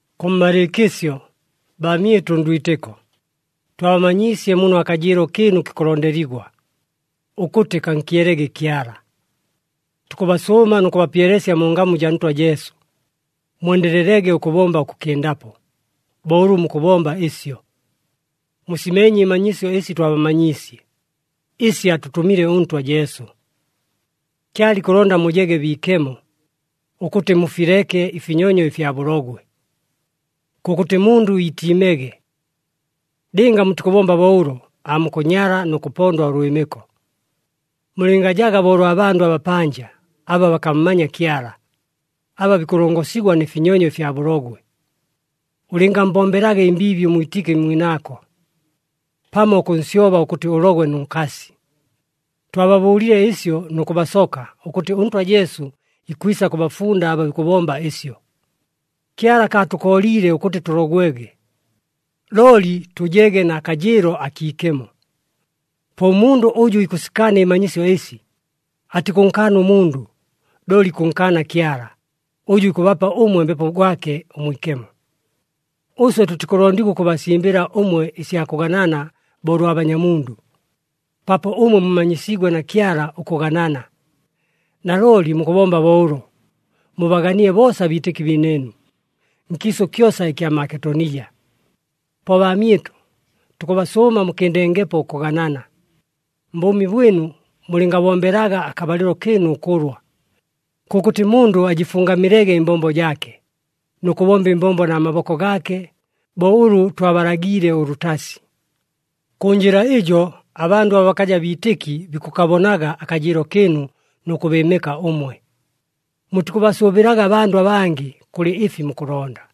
Kʉmmalɨɨkɨsyo, baamyɨtʉ ndwitɨko, twabamanyiisye muno akajɨɨlo kɨɨnu kikʉlondeligwa, ʉkʉtɨ kankyelege Kyala. Tukʉbasʉʉma nʉ kʉbapyelesya mu ngamu jaa Ntwa Jesu, mwendelelege ʉkʉbomba ʉkʉkɨndapo, bo ʉlʉ mukʉbomba ɨsyo. Musimeenye ɨmanyisyo ɨsi twabamanyiisye, ɨsi atʉtʉmile ʉNtwa Jesu. Kyala ikʉlonda mujege biikemo, ʉkʉtɨ mufileke ɨfinyonyo ɨfya bʉlogwe. Kʉkʉtɨ mundʉ iitiimege. Lɨnga mutikʉbomba bo ʉlo, aamukʉnyala nʉ kʉpondwa ʉlwɨmɨko. Mulɨngajaga bo ʉlwa bandʉ abapanja, aba bakammanya Kyala, aba bikʉlongosigwa nɨ finyonyo fya bʉlogwe. Ʉlɨngammbombelaga ɨmbiibi ʉmwitɨki mwinaako, pamo ʉkʉnsyoba ʉkʉtɨ ʉlogwe nʉ nkasi. Twababʉʉlile ɨsyo nʉ kʉbasoka ʉkʉtɨ ʉNtwa Jesu ikwisa kʉbafunda aba bikʉbomba ɨsyo. Kyala akaatʉkooliile ʉkʉtɨ tʉlogwege, looli tʉjege na kajɨɨlo akiikemo. Po ʉmundʉ ʉjʉ ikʉsikaana ɨmanyisyo ɨsi, atikʉnkaana ʉmundʉ, looli ikʉnkaana Kyala, ʉjʉ ikʉbapa ʉmwe Mbepo gwake ʉMwikemo. Ʉswe tʉtikʉlondigwa ʉkʉbasimbɨla ʉmwe ɨsya kʉganana bo ʉlwa banyamundʉ, paapo ʉmwe mumanyisiigwe na Kyala ʉkʉganana. Nalooli mukʉbomba bo ʉlo, mubaganile boosa abiitɨki biinɨɨnu, nkiisʉ kyosa ɨkya Maketonija. Po baamyɨtʉ, tukʉbasʉʉma mukɨndengepo ʉkʉganana. Mbʉʉmi bwɨnu, mulɨngabombelaga akabalɨlo kɨɨnu ʉkʉlwa. Kʉkʉtɨ mundʉ ajɨfungamilege ɨmbombo jaake, nʉ kʉbomba ɨmbombo na maboko gaake, bo ʉlʉ twabalagiile ʉlʉtasi. Kʉ njɨla ɨjo abandʉ aba bakaja biitɨki bikʉkabonaga akajɨɨlo kɨɨnu nʉ kʉbɨɨmɨka ʉmwe. Mutikʉbasʉʉbɨlaga abandʉ abangɨ kʉlɨ ɨfi mukʉlonda.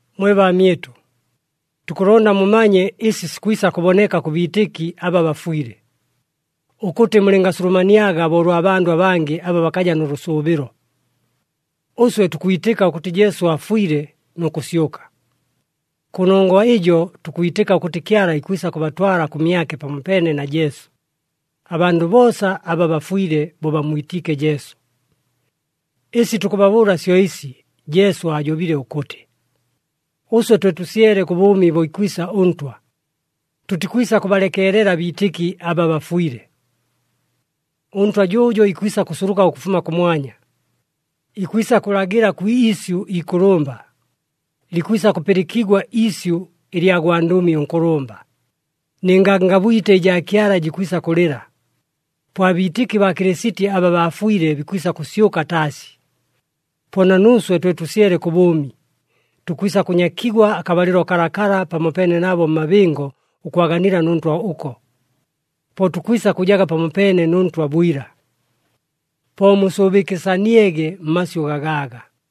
Mwe baamyɨtʉ, tukʉlonda mumanye ɨsi sikwisa kʉboneka kʉ biitɨki aba bafwile, ʉkʉtɨ mulɨngasulumaniaga bo ʉlwa bandʉ abangɨ aba bakaja nʉ lʉsʉʉbɨlo. Ʉswe tukwitɨka ʉkʉtɨ Jesu aafwile nʉ kʉsyʉka. Kʉnongwa ɨjo tukwitɨka ʉkʉtɨ Kyala ikwisa kʉbatwala kʉmyake pamopeene na Jesu, abandʉ boosa aba bafwile bo bammwitiike Jesu. Ɨsi tukʉbabʉʉla syo ɨsi Jesu aajobile ʉkʉtɨ, ʉswe twe tʉsyele kʉ bʉʉmi bo ikwisa ʉNtwa, tʉtikwisa kʉbalekeelela abiitɨki aba bafwile. ɄNtwa jʉʉjo ikwisa kʉsuluka ʉkʉfuma kʉmwanya, ikwisa kʉlagɨla kwi isyʉ ikʉlʉmba, likwisa kʉpɨlɨkigwa iisyʉ ɨlya gwandʉmi ʉnkʉlʉmba, nɨ ngangabwite ɨjaa Kyala jikwisa kʉlɨla. Po abiitɨki baa Kɨlɨsiti aba baafwile, bikwisa kʉsyʉka taasi. Po na nuuswe twe tʉsyele kʉ bʉʉmi, tukwisa kʉnyakigwa akabalɨlo kalakala pamopeene nabo mmabɨngo ʉkwaganila nʉ Ntwa ʉko. Po tukwisa kʉjaga pamopeene nʉ Ntwa bwila. Po musʉʉbɨkɨsaniege mmasyʉ gagaaga.